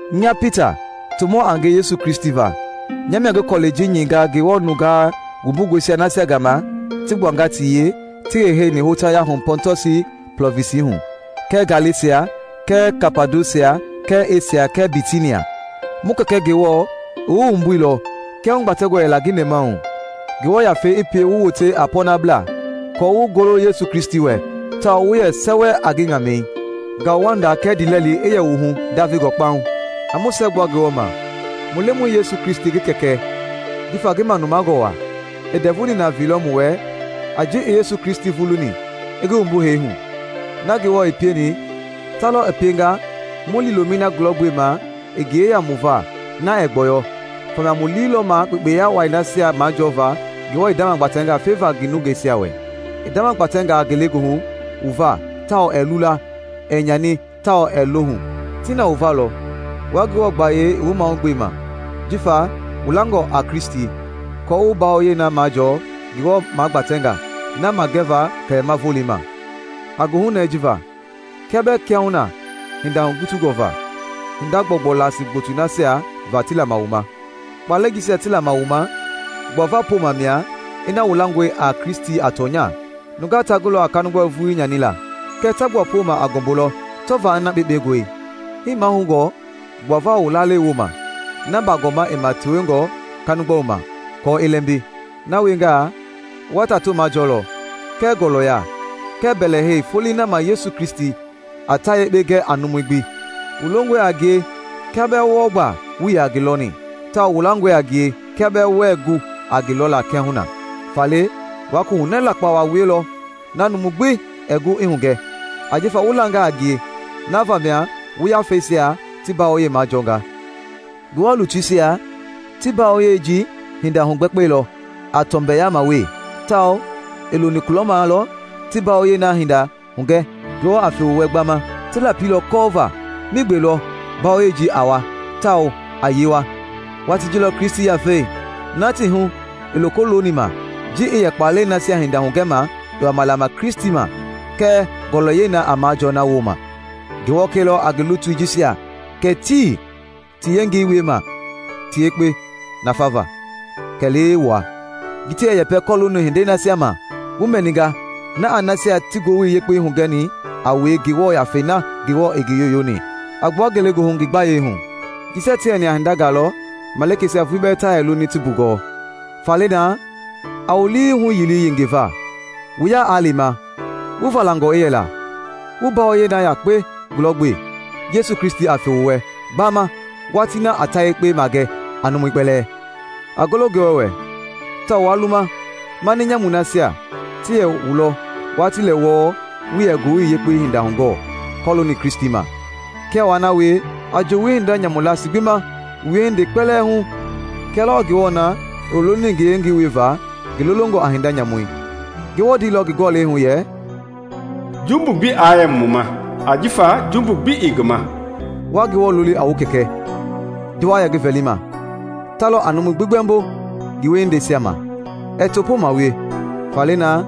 Nya Pita, tomɔ a nge Yesu Kristi va, nya mia ngi kɔlɛi ji nyɛinga Ngewɔ nungaa wumbungɔi nasia gama ti gbuanga ti yee ti heiheini hotaya hu Pɔntɔsi plɔvinsi hu, kɛɛ Galesia kɛɛ Kapadosia kɛɛ Esia kɛɛ Bitinia. Mu Kɛkɛ Ngewɔ i wu wumbuilɔ kia hugbatɛngɔ yɛla ngi nɛmahu, Ngewɔ Yafei i pie wu wote a pɔɔnablaa aako wu golo Yesu Kristi wɛ, tawao wu yɛ sɛwɛ a ngi ŋamɛi. Ngauwanda kɛɛ ndiilɛli i yɛ wu hu ndavengɔ kpauŋ. A mu siɛgbua Ngewɔ ma, mu Lemɔi Yesu Kristi ngi Kɛkɛ! Jifa ngi manumangɔ waa, i ndɛvu nina veilɔ mu wɛ a ji i Yesu Kristi vuluni i ngi wumbu hee hu. Na Ngewɔ i pieni, ta lɔ i pienga mu liilomɛi na gulɔgbema i yeya mu va na ɛɛ gbɔyɔ; famia mu lii lɔ ma kpekpeya wai nasia majɔɔva Ngewɔ i ndamagbatɛnga feva ngi nungeisia wɛ. I ndamagbatɛnga ngelegoohu wu va tawao ɛɛ lula, ɛɛ nyani tawao ɛɛ lohu. Ti na wu va lɔ, wua Ngewɔ gbayei i wu mahugbema jifa wu langɔ a Kristi aako wu mbawoyei na majɔɔ Ngewɔ magbatɛngɔ na magɛva kɛlɛma volei ma. A goohunɛɛ ji va, kia bɛɛ kiahuna hinda hugutungɔ va hinda gbɔugbɔu laasi gbotoi nasia va ti lama wu ma. Kpaalɛi jisia ti lama wu ma gbuava pooma mia ina wu langɔe a Kristi a tɔnya. Nungaa ta gulɔ a kanigbɔlui vulii nyanila, kɛɛ ta gbua pooma a ngɔmbui lɔ tɔva ina kpekpengɔe; hii mahoungɔ gbuava wu lalei wooma na baagɔma i ma tewengɔ kanigbɔlui ma, aako i lɛmbi. Na wiengaa, wa tato majɔɔlɔ kɛɛ ngɔlɔya kɛɛ mbɛlɛhei Folei na ma Yesu Kristi a ta yekpe gɛ a numui gbi. Wu longɔe a ngie kia bɛɛ wɔɔ gba wuii yaa ngi lɔni, tawao wu langɔe a ngie, kia bɛɛ wuɛɛ gu a ngi lɔla kiahuna. Faale wa koohunɛɛ lakpa waa wielɔ na numu gbi ɛɛ gu i hungɛ, ajifa wu langa a ngie, na vamia wu yafeisia ti mbawoyei majɔɔnga. Ngewɔ lutuisia ti mbawoyei ji hinda hugbɛkpɛilɔ a, tɔmbɛyama wee, tawao i loni kulɔma lɔ ti mbawoyei na hinda hugɛ Ngewɔ a fe wu wɛ gbama. Ti lapilɔ kɔɔva migbe lɔ mbawoyei ji a wa tawao a yee wa. Watii ji lɔ Kristi Yafei na i ti hu i loko loni ma ji i yɛ kpaalɛi nasia hinda hugɛma i wama lama Kristi ma kɛɛ ngɔlɔyɛi na a majɔɔ na wooma. Ngewɔ kɛilɔ a ngi lutui jisia kɛ tii ti yengei wiema ti yekpe nafava kɛlee wua, ji ti yɛ yɛpɛ kɔlooni hindei nasia ma wu mɛninga na a nasia ti Ngowili Yekpei hugɛni a wue Ngewɔ Yafei na Ngewɔ i ngi yoyoni a gbua ngelegoohu ngi gbayei hu. Jisia ti yɛni a hindangaa lɔ malikeisia vulii bɛɛ ta yɛ loni ti mbugɔɔ. Faale naa, a wu lii huyili yengeva. Wu ya aa lema, wu valangɔ i yɛla, wu mbawoyei na yakpe gulɔgbe Yesu Kristi a fe wu wɛ gbama watii na a ta yekpe magɛ a numui kpɛlɛɛ. A golo Ngewɔ wɛ tawao waa luma mani nyamui nasia ti yɛ wu lɔ watii lɛ wɔɔ wuii yɛ Ngowili Yekpei hinda hugɔɔ kɔlooni Kristi ma. Kia waa na wie, a joowi hinda nyamu laasi gbi ma wu wiehindei kpɛlɛɛ hu kia lɔɔ Ngewɔ na i wu lolini ngi yengei wieva ngi lolongɔ a hinda nyamu. Ngewɔ ndeilɔ ngi Gɔlɛi hu yɛ, “Jumbu gbi aa yɛ wu ma ajifa jumbu gbi ii nya ma.” Wa Ngewɔ loli a wu Kɛkɛ, ji wa yɛ ngi vɛlima; ta lɔ a numui gbi gbɛmbo ngi wiehindeisia ma. Ɛɛ topooma wie. Faale naa,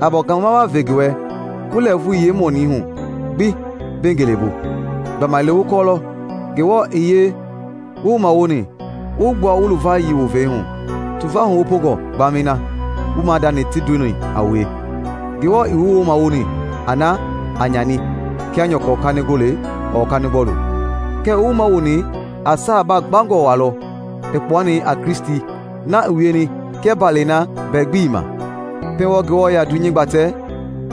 a baagɔma waa ve ngi wɛ wu lɛɛvui yeemɔni hu gbi mbei ngelebu. Gbamaile wu kɔɔlɔ Ngewɔ i yee wu wumawoni i wu gbua wu luvayii wovei hu, tuva huwopongɔ gbamɛi na wu maadani ti ndoni a wue. Ngewɔ ii wu wumawoni a na a nyani kia nyɔkɔ kanigole ɔɔ kanigbɔlu, kɛɛ i wu wumawoni a saa baagbangɔ waa lɔ i kpuani a Kristi na i wieni kia mbaalɛi na mbɛ gbi ii ma. Pɛiŋ wɔɔ Ngewɔ i yaa dunyei gbatɛ,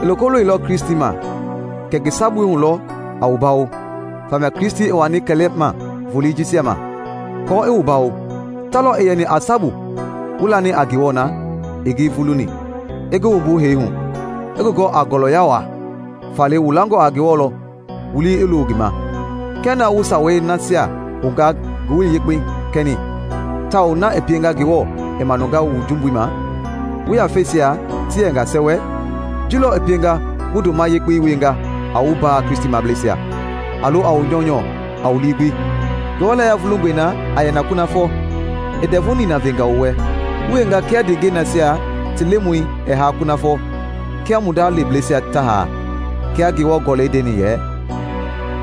i loko loilɔ Kristi ma kɛ ngi sabui hu lɔ a wu bawo; famia Kristi i wani kɛlɛma volei jisia ma kɔɔ i wu bawo. Ta lɔ i yɛni a sabu wu lani a Ngewɔ na i ngi vuluni, i ngi wumbu hee hu, i ngi gɔ a ngɔlɔya waa; faale wu langɔ a Ngewɔ lɔ, wu lii i looni ngi ma. Kia naa wu sawei nasia hounga Ngowili Yekpei kɛni tawao na i pienga Ngewɔ i manunga wu jumbui ma wu yafeisia ti yɛnga sɛwɛ, ji lɔ i pienga wu ndoma yekpe wienga a wu mbaa Kristimableisia, a lo a wu nyɔunyɔ a wu lii gbi. Ngewɔ layia vulungɔe na a yɛ na kunafɔ, i ndɛvu nina venga wu wɛ, wu wienga kia ndeengɛi nasia ti lemɔi ɛɛ haa kunafɔ kia mu nda leblɛisia ta haa. Kia Ngewɔ Gɔlɛi ndeni yɛ,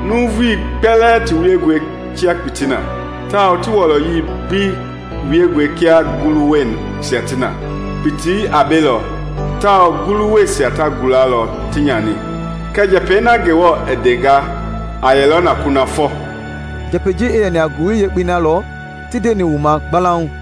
“Nuuvui kpɛlɛɛ ti wiengɔe kia kpitii i na, tawao ti wɔlɔyɛi gbi wiengɔe kia ngulu-wuɛisia ti na. Kpitii a belɔ, tawao ngulu-wuɛisia ta gulalɔ ti nyani, kɛɛ njɛpɛi na Ndemɔi i ndenga a yɛlɔ na kunafɔ.” Njɛpɛi ji i yɛni a Ngowili Yekpei na lɔ ti ndeni wu ma gbalauŋ.